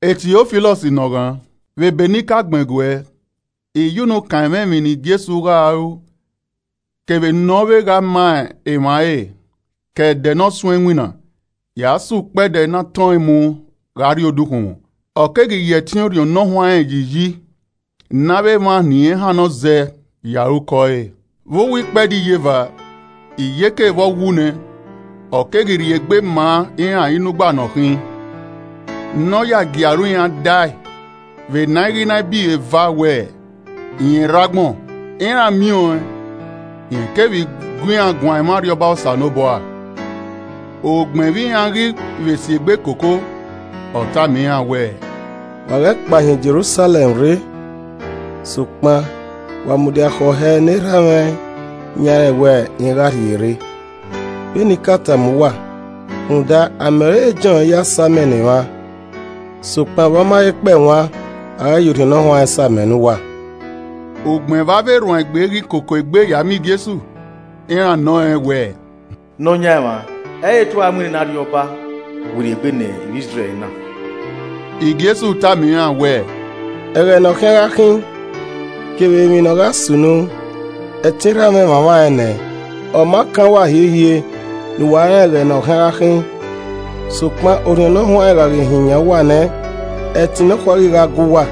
Tiofilọs ne ọ ghan: Vbe ebe ne I ka gbẹn guẹ, I ya unu kan ẹmwẹ emwi ne Jesu gha ru kevbe ne ọ vbe gha ma emwa ẹre ke ẹdẹ ne ọ suẹn iwinna. Ya sẹ ẹdẹ ne a tọn ẹn mu gha rrie odukhunmwu, ọ keghi ya ẹtin Orhiọn Ne Ọ Huanrẹn yi iyi ne avbe emwa ne irẹn hannọ zẹ ya ru ukọ ẹre. Vbe uwu ikpẹdẹ iyeva, iyeke vbe ọ wu nẹ, ọ keghi rhie egbe maa iran inugba ne ọ khin, ne ọ ya gie aro iran dae vbene a i ghi na bọ iro eva wẹẹ, rẹn rre agbọn. Iran miẹn ọẹn, rẹn keghi vbe gu iran guan ẹmwẹ Arriọba Osanobua. Ugbẹn vbe iran ghi vbe si egbe koko, ọ tama iran wẹẹ, “Wa ghẹ kpa hin Jerusalẹm rre, sokpan, wa mudia khẹ ọhẹ ne erha mwẹ yan rẹn wẹ irẹn gha rhie rre, vbene I ka tama uwa. Rhunmwuda, amẹ ọre Jọn ya sa amẹ ne emwa, sokpan vbe ọ ma he kpẹe wan, a gha ya Orhiọn Ne Ọ Huanrẹn sa amẹ ne uwa.” Ugbẹn vbe avbe erhuanegbe ghi koko egbe ya miẹn Jesu, iran nọ rẹn wẹẹ, “Nọyaẹnmwa, ẹ i re te u ra mu nene Arriọba werriegbe ne ivbi Izrẹl na?” Jesu tama iran wẹẹ, “Ẹghẹ ne ọ khian gha khin, kevbe emwi ne ọ gha sunu, ẹtin Erha mwẹ mwamwa ẹn nẹ, ọ ma kan uwa hiehiere ne uwa rẹn ẹghẹ ne ọ khian gha khin. Sokpan Orhiọn Ne Ọ Huanrẹn gha ghi hin yan uwa nẹ, ẹtin nọkhua ghi gha gue uwa,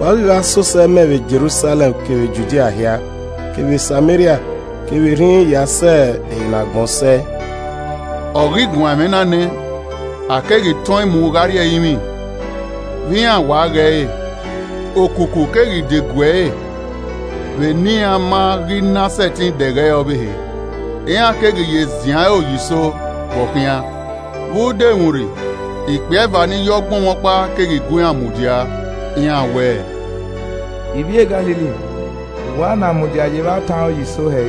wa ghi ya sẹ osẹe mẹ vbe Jerusalẹm kevbe Judia hia, kevbe Sameria, kevbe rhinrin ya sẹ ehe ne agbọn sẹe.” Ọ ghi guan ẹmwẹ na nẹ, a keghi tọn mu gha rrie ẹrinmwi vbe iran wa ghe ẹre. Okuku keghi degue ẹre vbe ne iran ma ghi na sẹtin dẹghe ẹre ọvbehe. Iran keghi ye ziẹn aro ye iso vbe ọ khian, vbe udomwurri, ikpia eva ni yọ ogbọnmwọkpa keghi gu iran mudia. Iran wẹẹ, “Ivbi e Galili, vbe uwa na mudia ye evba tan aro ye iso hẹ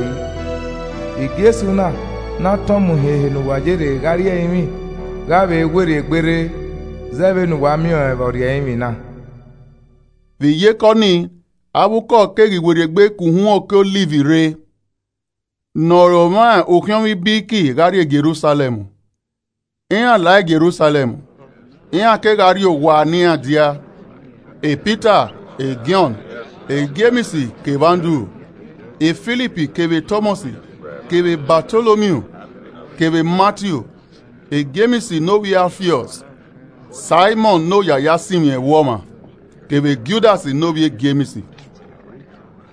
yi? Jesu na ne a tọn mu hin ehe ne uwa ye rre gha rrie ẹrinmwi, gha vbe werriegbe rre zẹ vbene uwa miẹn ọẹn vbe ọ rrie ẹrinmwi na.” Vbe iyeke ọnii, avbe ukọ keghi werriegbe ke uhunmwu oke Ọliv rre, ne ọ re omwa ukhiọnmwẹ ibiriki gha rrie Jerusalẹm. Iran la Jerusalẹm, iran kegha rrie owa ne iran dia: Pita, Jọn, Jems, kevbe Andru, Filip kevbe Tọmọs kevbe Batolomiu kevbe Matiu, Jems ne ovbi Alfiọs, Saimọn, ne ọya a ya sinmwi ẹvbo ọmwa, kevbe Judas ne ovbi e Jems.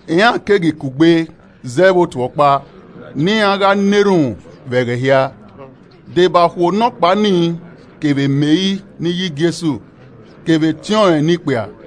Iran keghi kugbe zẹẹ vbe otu ọkpa, ne iran gha na erhunmwu vbe ẹghẹ hia, deba okhuo nọkpa nii, kevbe Meri ne iye Jesu, kevbe etiọnrẹn ne ikpia.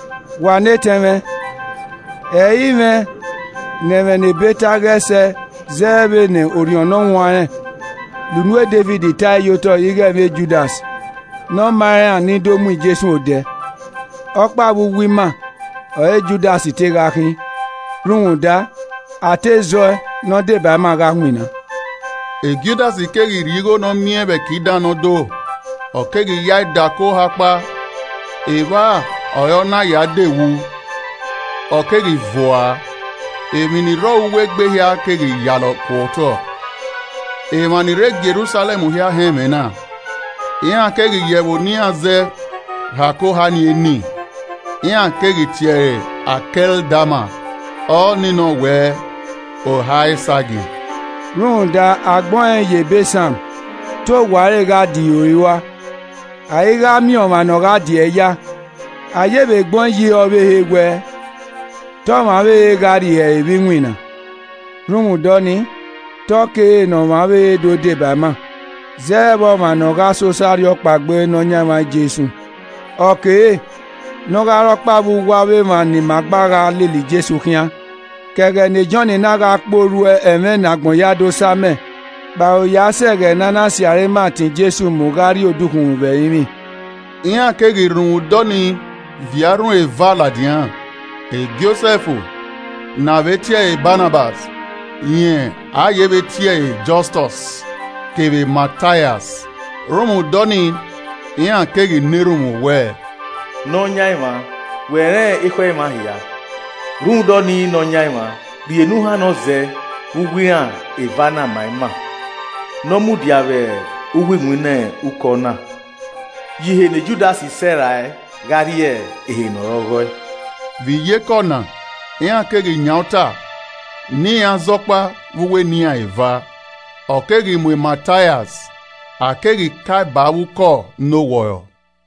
“Wa ne etẹn mwẹ: Ẹ i mwẹ ne ẹmwẹ ne ebe ta ẹe ghẹ sẹ zẹ vbene Orhiọn Ne Ọ Huanrẹn la unu Devid ta ẹe ye otọ ighe ẹmwẹ Judas ne ọ ma iran ni do mu Jesu odẹ. Ọkpa vbe uwu ima ọre Judas te gha khin, rhunmwuda a te zẹ ọe ne ọ deba ima gha winna.” (Judas keghi rhie igho ne ọ miẹn vbe ẹki dan ne ọ do, ọ keghi ya ẹe dẹ ako oha ọkpa, evba ọre ọ na ya de wu, ọ keghi vuaa, emwi ni rre uwu egbe ẹre hia keghi yalọ ku otọ. Emwa ni rre Jerusalẹm hia họn ẹmwẹ na. Iran keghi ya ẹvbo ne iran zẹ he ako oha nii eni. Iran keghi ti ẹre Akẹldama, ọ ni nọ wẹ “Oha Esagiẹn.”) “Rhunmwuda a gbẹn ọẹn ye ebe Psalm, “ ‘Te owa ẹre gha dihoi rua, a i gha miẹn ọmwa ne ọ gha diẹe ya.’ A ye vbe gbẹn ọẹn ye ihe ọvbehe wẹẹ: ‘Te ọmwa ọvbehe gha rhie ihe ẹre vbe iwinna.’ “Rhunmwuda ọnii, te ọ kere ne ọmwa ọvbehe do deba ima zẹ vbe ọmwa ne ọ gha sẹ osẹe arhiọkpaegbe Nọyaẹnmwa Jesu. Ọ kere ne ọ gha re ọkpa vbe uwu avbe emwa ne ima gba gha lele Jesu khian ke ẹghẹ ne Jọn na gha kpe orhu ẹmwẹ ne agbọn hia do sa amẹ kpao, ya sẹ ẹghẹ ne a na sirra ima tọn Jesu mu gha rrie odukhunmwu vbe ẹrinmwi.” Iran keghi rhunmwuda ọnii viọ arhin eva ladian: Josẹf ne a vbe tie ẹre Banabas (rẹn a yevbe tie ẹre Jọstọs) kevbe Mataias. Rhunmwuda ọnii iran keghi na erhunmwu wẹẹ, “Nọyaẹnmwa wẹ rẹn ekhọe emwa hia. Rhunmwuda ọnii Nọyaẹnmwa rhie ne u hannọ zẹ vbe uwu iran eva na ma ima. Ne ọ mudia vbe uwu iwinna ukọ na, ye ihe ne Judas sẹrae gha rrie ehe ne ọre ọghọe.” Vbe iyeke ọna, iran keghi yan uta ne iran zẹ ọkpa vbe uwu eni iran eva. Ọ keghi mu Mataias, a keghi kae ba avbe ukọ ne owọrọ.